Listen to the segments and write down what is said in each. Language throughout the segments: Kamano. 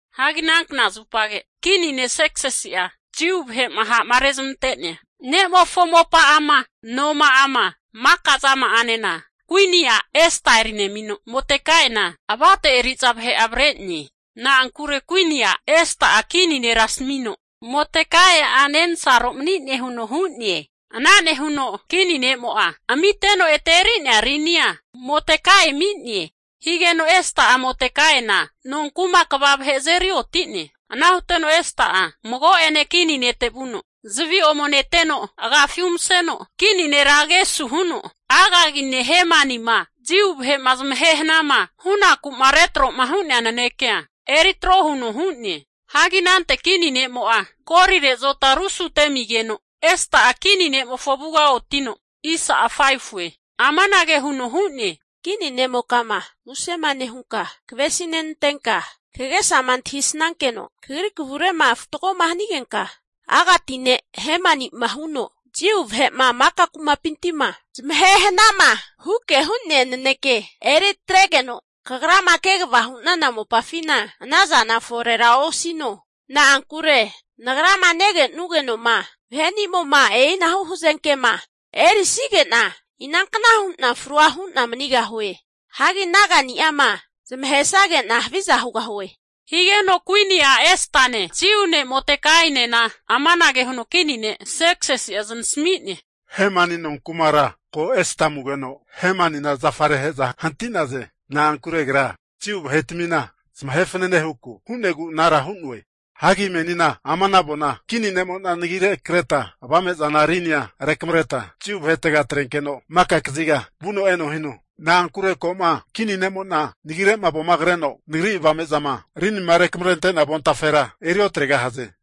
Hagi ana knazupage kini ne' Serksisi'a Jiu vahe'ma ha'ma rezmantea ne'mofo mopa'ama, noma'ama maka zama'anena kuini a' Esta eri nemino, Modekaina avate eri'za vahe avre'ne. Na'ankure kuini a' Esta'a kini nera asamino Modekaia nensaro mani'ne huno hu'ne. Ana nehuno kini ne'mo'a amiteno ete eri'nea rinia Modekai ami'ne. Higeno Esta'a Modekaina nonku'ma kva vahe azeri oti'ne. Ana huteno Esta'a mago'ane kini nete vuno, zavi ome neteno agafi umaseno kini nera agesu huno, Agagi ne' Hemani'ma Jiu vahe'ma zamahe hana'ma hunaku'ma retro'ma hu'nea nanekea eri atro huno hu'ne. Hagi anante kini ne'mo'a golire azota arusute amigeno Esta'a kini ne'mofo avuga oti'no, amanage huno hu'ne, Kini ne'mokama musema nehunka, kavesi nantenka, kagesama antahisankeno kagri kavure'ma fatgoma hanigenka, Agati ne' Hemani'ma huno, Jiu vahe'ma maka kumapinti'ma zamahe hanama huke hu'nea naneke eri atregeno kagrama kegava hu'nana mopafina ana zana forera osino. Na'ankure nagrama nege'nugeno'ma vahenimo'ma e'inahu hazenkema erisage'na inankna hu'na frua hu'na manigahue. Hagi naga'ni'ama zamahesage'na haviza hugahue. Higeno kuini a' Estane Jiu ne' Modekainena amanage huno kini ne' Serksisi'a znasmi'ne, Hemani nonkumara ko Esta amugeno, Hemanina zafare ahe'za hanti'naze. Na'ankure agra Jiu vahetmina zamahe fanane huke hu'negu anara hu'noe. Hagi menina ama'na avona kini ne'mo'na nagire kreta avame'zana rinini'a rekamareta Jiu vahetega atrenkeno maka kaziga vuno eno hino. Na'ankure ko'ma kini ne'mo'na nagire'ma avoma kreno, nagri avame'zama rinima rekamrentea avontafera eri otregahaze.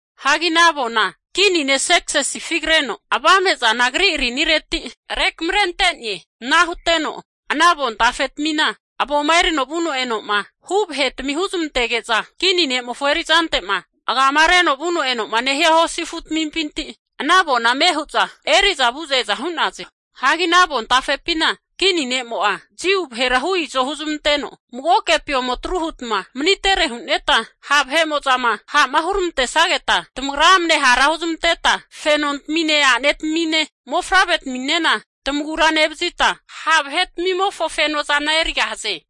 Hagi ana avona kini ne' Serksisi agifi kreno, avame'zana agri rinireti rekamarente'ne. Ana huteno ana avontafe tamina avoma erino vuno eno'ma hu vahetami huzmantege'za kini ne'mofo erizante'ma agamareno vuno eno'ma nehia hosi afutamimpi ana avona ame hu'za eri'za vu'za eza hu'naze. Hagi ana avontafepina kini ne'mo'a Jiu vahera hu izo huzmanteno, magokepi ome atru hutma manitere hu'neta ha'ma vahe'mo'zama huramantesageta tamagra amne hara huzmanteta fenontamine a'netamine mofavre'taminena tamagura nevazita, ha' vahetamimofo fenozana erigahaze huno krentene.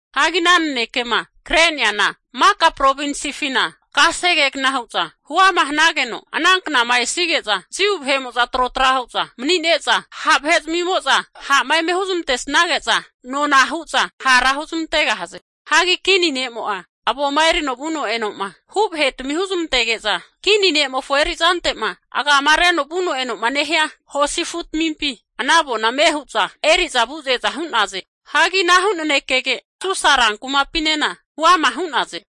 Hagi ana nanekema kre'neana maka provinsifina kasegegna hu'za huama hanageno, ana knama esige'za Jiu vahe'mo'za trotra hu'za mani'ne'za ha' vahe'zamimo'za ha'ma eme huzmantesnage'za, nona hu'za hara huzmantegahaze. Hagi kini ne'mo'a avoma erino vuno eno'ma hu vahetami huzmantege'za kini ne'mofo erizante'ma agamareno vuno eno'ma nehia hosi afutamimpi, ana avona ame huza eri'za vu'za e'za hu'naze. Hagi anahu nanekege Susa rankumapinena huama hu'naze.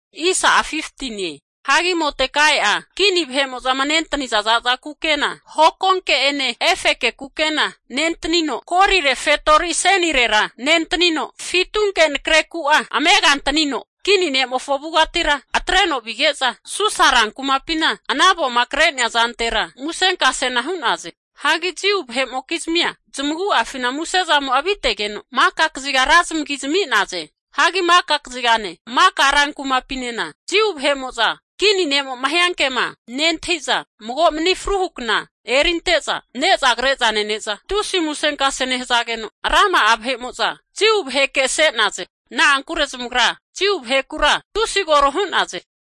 Hagi Modekai'a kini vahe'mo'zama nentaniza za'za kukena hokonke'ene efeke kukena nentanino, golire fetori asenirera nentanino, fitunke nakre ku'a amega antanino kini ne'mofo avugatira atreno vige'za Susa rankumapina ana avoma kre'nea zantera musenkasena hu'naze. Hagi Jiu vahe'mokizmia, zamagu'afina muse zamo'a avitegeno, maka kaziga ra zamigi zami'naze. Hagi maka kazigane maka rankumapinena Jiu vahe'mo'za kini ne'mo'ma hiankema nentahi'za mago mani fruhu kna erinte'za ne'za kre'za nene'za, tusi musenkase nehazageno rama'a vahe'mo'za Jiu vahekese'naze. Na'ankure zamagra Jiu vahekura tusi koro hu'naze.